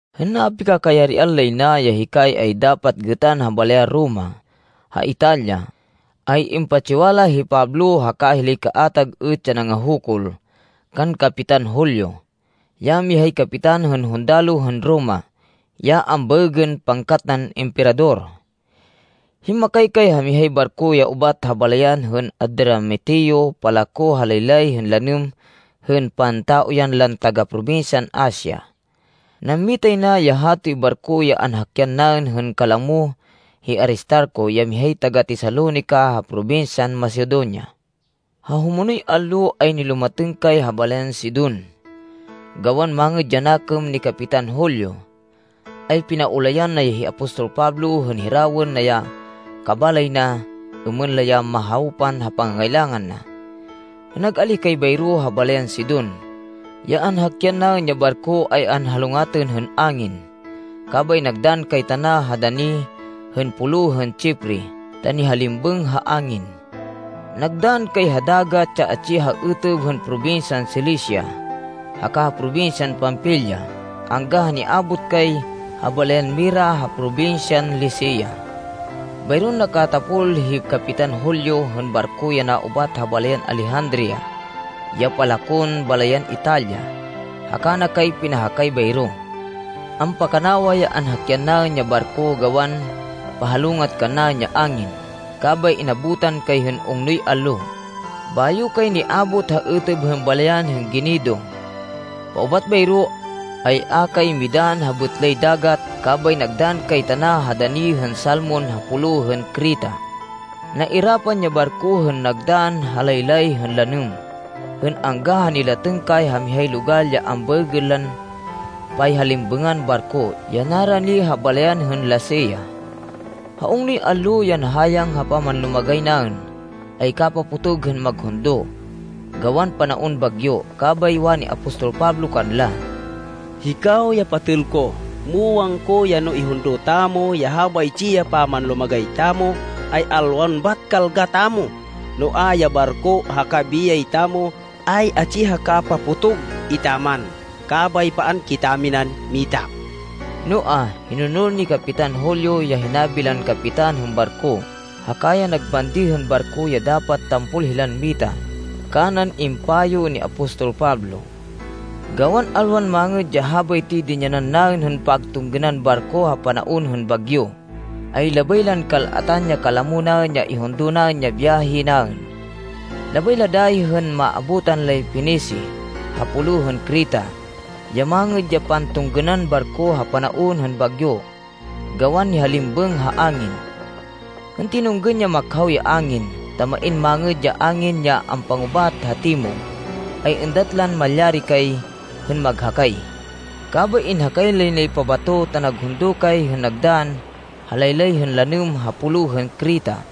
Hên napikakayarian lay na, ya hikay ay dapat gêtan ha balayan Roma, ha Italia, ay impatsiwala hi Pablo haka hilay kaatag êt ya nangahukul, kan Kapitan Julio, ya mihay kapitan hên hundaloh hên Roma, ya ambaêgên “Pangkat nan Emperador.” Himmakay kay ha mihay barko ya ubat ha balayan hên Adramitio palako ha laylay hên lanêm hên pantauyan lan taga probinsyan Asia. Nammitay na ya hatoy barko ya anhakyan naên hên kalamo hi Aristarco ya mihay taga-Tesalonica ha probinsyan Macedonia. Ha humonoy allo, ay nilumatêng kay ha balayan Sidon. Gawan mangêd ya nakêm ni Kapitan Julio, ay pinaulayan na ya hi apostol Pablo hên hirawên na ya kabalay na, êmên la ya mahawpan ha pangangailangan na. Hên nag-alíh kay bayro ha balayan Sidon, ya anhakyan naên ya barko ay anhalongatên hên angin, kabay nagdann kay tana ha dani hên pulo hên Chipre ta nihalimbêng ha angin. Nagdann kay ha dagat ya atsi ha êtêb hên probinsyan Cilicia, haka ha probinsyan Panfilia angga ha niabot kay ha balayan Mira ha probinsyan Licia. Bayron nakatapol hi Kapitan Julio hên barko ya naubat ha balayan Alejandria ya palakon balayan Italia, haka na kay pinahakay bayro. Ampakanawa ya anhakyan naên ya barko gawan pahalongat kannaên ya angin, kabay inabutan kay hên ungnoy allo, bayo kay niabot ha êtêb hên balayan hên Gnido. Paubat bayro, ay a kay midann ha bêtlay dagat kabay nagdann kay tana ha dani hên Salmon ha Pulo hên Creta. Nairapan ya barko hên nagdann ha laylay hên lanêm hên angga ha nilatêng kay ha mihay logal ya ambaêgên lan Payhalimbêngan Barko ya narani ha balayan hên Lasea. Ha ungnoy allo ya nahayang ha pamanlumagay naên, ay kapapotog hên maghundo, gawan panaon bagyo. Kabay wani apostol Pablo kanla, “Hikaw ya patêl ko, muwang ko ya no ihundo tamo ya habaytsi ya pamanlumagay tamo, ay alwan bat kalga tamo, noa, ya barko haka biyay tamo ay atsi ha kapapotog etaman. Kabay paan kitaminan mita.” Noa, hinonol ni Kapitan Julio ya hinabi lan kapitan hên barko haka ya nagbandi hên barko ya dapat tampol hilan mita, kanan impayo ni apostol Pablo. Gawan alwan mangêd ya habaytoy dinyanan naên hên pagtunggênan barko ha panaon hên bagyo, ay labay lan kal-atan ya kalamo naên ya ihundo naên ya biyahe naên. Labay la dayi hên maabutan lay Fenice ha pulo hên Creta, ya mangêd ya pantunggênan barko ha panaon hên bagyo gawan nihalimbêng ha angin. Hên tinunggên ya makhaw ya angin, ta main mangêd ya angin ya ampangubat ha timog, ay êndat lan malyari kay hên maghakay. Kabay inhakay lay nay pabato, ta naghundo kay hên nagdann ha laylay hên lanêm ha Pulo hên Creta.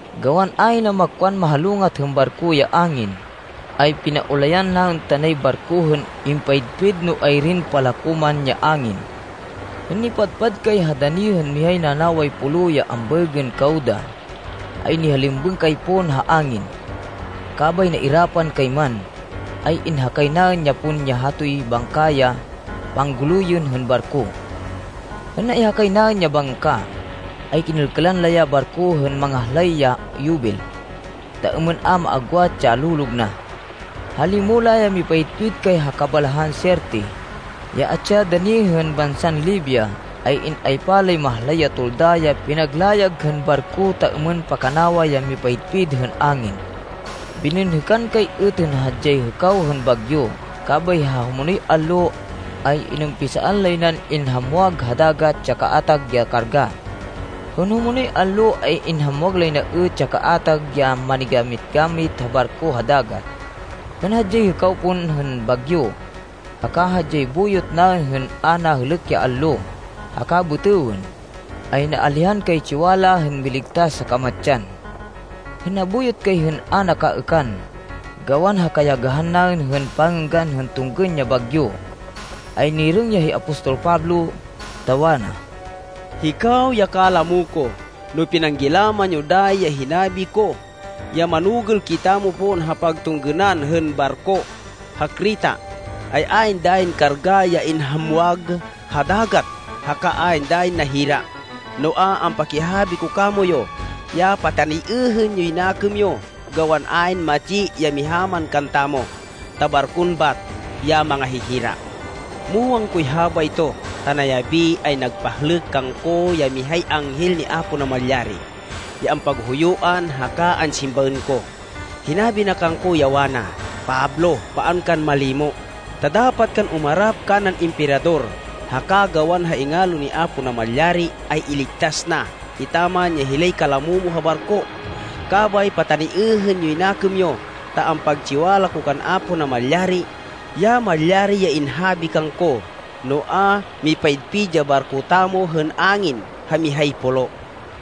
Gawan ahina makwan mahalongat hên barko ya angin, ay pinaulayan naên tanay barko hên impayidpid no ayrin palako man ya angin. Hên nipadpad kay ha dani hên mihay nanaway pulo ya ambaêgên Cauda, ay nihalimbêng kay pon ha angin, kabay nairapan kay man, ay inhakay naên ya pon ya hatoy bangka ya pangguluyên hên barko. Hên naihakay naên ya bangka, ay kinêlkêlan la ya barko hên mangahlay ya yubil ta êmên a maagwat ya lolog na. Ha limo la ya mipayidpid kay ha kabalahan Sirte, ya atsi ha dani hên bansan Libia, ay in-aypa lay mahlay ya tolda ya pinaglayag hên barko ta êmên pakanawa yan mipayidpid hên angin. Bininhêkan kay êt hên hadyay hêkaw hên bagyo, kabay ha humonoy allo, ay inumpisaan lay nan inhamwag ha dagat ya kaatag ya karga. Hên humonoy allo, ay inhamwag lay na êt ya kaatag ya manigamit-gamit hên barko ha dagat. Hên hadyay hêkaw pon hên bagyo, haka hadyay buyot naên hên a nahêlêk ya allo haka bêtêwên, ay naalihan kay tsiwala hên miligtas ha kamatsan. Hên nabuyot kay hên a nakaêkan, gawan ha kayagahan naên hên pangênggan hên tunggên ya bagyo, ay nirêng ya hi apostol Pablo, ta wana, “Hikaw ya kalamo ko, no pinanggilaman yo dayi ya hinabi ko ya manugêl kitamo pon ha pagtunggênan hên barko ha Creta, ay ayn dayin karga ya inhamwag ha dagat haka ayn dayin nahira. Noa, ampakihabi ko kamoyu ya pataniêhên yoy nakêm yo, gawan ayn matsi ya miha man kantamo, ta barkon bat ya mangahihira. Muwang koy habayto, ta nayabi ay nagpahlêk kangko ya mihay anghel ni Apo Namalyari, ya ampaghuyuan haka ansimbaên ko. Hinabi na kangko ya wana, ‘Pablo, paan kan malimo, ta dapat kan umarap kanan Emperador. Haka gawan ha ingalo ni Apo Namalyari, ay iligtas na etaman ya hilay kalamo mo ha barko.’ Kabay pataniêhên yoy nakêm yo, ta ampagtsiwala ko kan Apo Namalyari, ya malyari ya inhabi kangko. Noa, mipayidpid ya barko tamo hên angin ha mihay pulo.”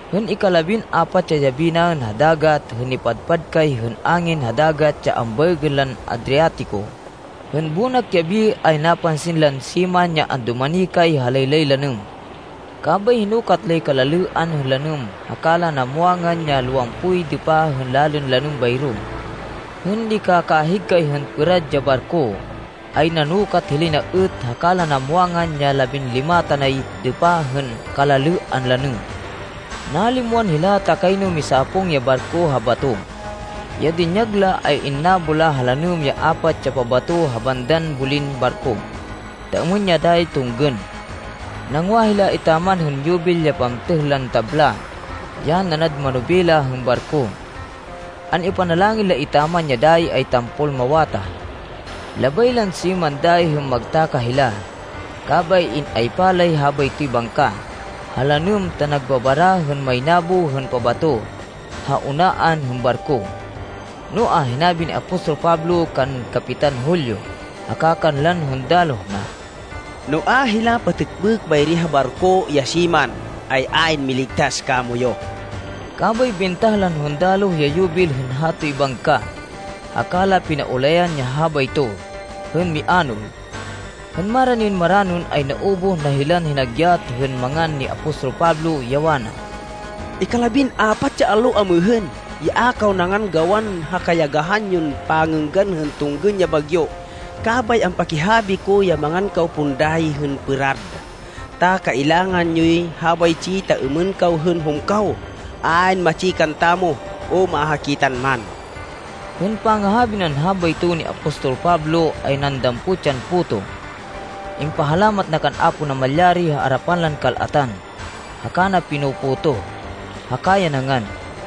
Hên ikalabin-apat ya yabi naên ha dagat, hên nipadpad kay hên angin ha dagat ya ambaêgên lan Adriatico, hên bonak yabi ay napansin lan siman ya andumani kay ha laylay lanêm. Kabay hinukat lay kalalêan hên lanêm haka la namwangan ya lowampoy dêpa hên lalên lanêm bayro. Hên nikakahig hên pêrad ya barko, ay nanukat hilay na êt haka la namwangan ya labinlima tanay dêpa hên kalalêan lanêm. Nalimwan hila, ta kayno misapung ya barko ha bato. Ya dinyag la, ay innabo la ha lanêm ya apat ya pabato ha bandan bulin barko, ta êmên ya dayi tunggên. (Nangwa hila etaman hên yubil ya pamtêh lan tabla, ya nanad manobela hên barko.) An-ipanalangin la etaman, ya dayi ay tampol mawatah. Labay lan siman dayi hên magtakah hila, kabay in-aypa lay habaytoy bangka ha lanêm ta nagbabara hên maynabo hên pabato ha unaan hên barko. Noa, hinabi ni apostol Pablo kan Kapitan Julio haka kanlan hundaloh na, “No a hila patêkbêk bayri ha barko ya siman, ay ayn miligtas kamoyu.” Kabay bintah lan hundaloh ya yubil hên hatoy bangka, haka la pinaulayan ya habayto hên mianol. Hên maranin maranon, ay naubuh na hilan hinagyat hên mangan ni apostol Pablo, ya wana, “Ikalabin-apat ya allo amêhên, ya a kaw nangan gawan ha kayagahan yon pangênggan hên tunggên ya bagyo. Kabay ampakihabi ko ya mangan kaw pon dayi hên pêrad, ta kailangan yoy habaytsi ta êmên kaw hên humkaw. Ayn matsi kantamo, o mahakitan man.” Hên pangahabi nan habayto ni apostol Pablo, ay nandampot yan puto, impahalamat na kan Apo Namalyari ha arapan lan kal-atan, haka na pinutoh-potoh, haka ya nangan.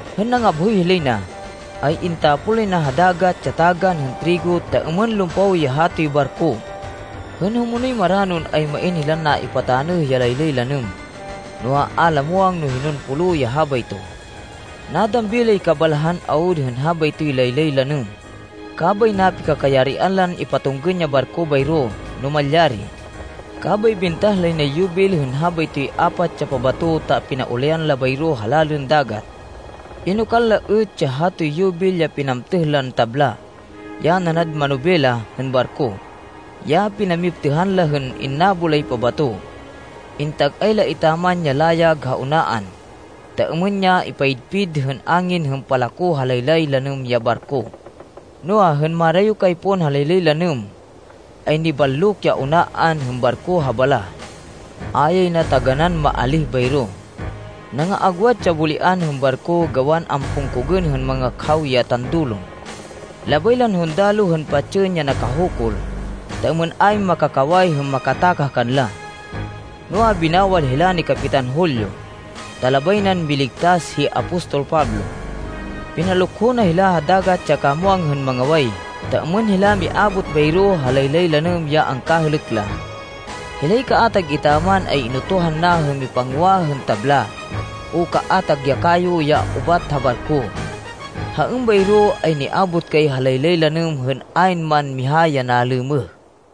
Hên nangabhoy hilay na, ay intapon lay na ha dagat ya tagan hên trigo ta êmên lumpaw ya hatoy barko. Hên humonoy maranon, ay main hilan naipatanêh ya laylay lanêm, noa, a la muwang no hinon pulo ya habayto. Nadambi lay kabalahan awud hên habaytoy laylay lanêm, kabay napikakayarian lan ipatunggên ya barko bayro no malyari. Kabay bintah lay nay yubil hên habaytoy apat ya pabato ta pinaulayan la bayro ha lalên dagat. Inokal la êt ya hatoy yubil ya pinamtêh lan tabla, ya nanad manobela hên barko, ya pinamiptêhan la hên innabo lay pabato. Intag-ay la etaman ya layag ha unaan, ta êmên ya ipayidpid hên angin hên palako ha laylay lanêm ya barko. Noa, hên marayo kay pon ha laylay lanêm, ay niballok ya unaan hên barko ha balah. A yay na taganán maalíh bayro. Nangaagwat ya bulian hên barko gawan ampungkogên hên mangakhaw ya tandulon. Labay lan hundaloh hên patsên ya nakahukul ta êmên ayn makakaway hên makatakah kanla. Noa, binawal hila ni Kapitan Julio, ta labay nan miligtas hi apostol Pablo. Pinalukho na hila ha dagat ya kamwang hên mangaway ta êmên hila miabot bayro ha laylay lanêm ya angkahêlêk la. Hilay kaatag etaman ay inutuhan na hên mipangwa hên tabla o kaatag ya kayo ya ubat ha barko. Ha êmbayro ay niabot kay ha laylay lanêm hên ayn man miha ya nalêmêh.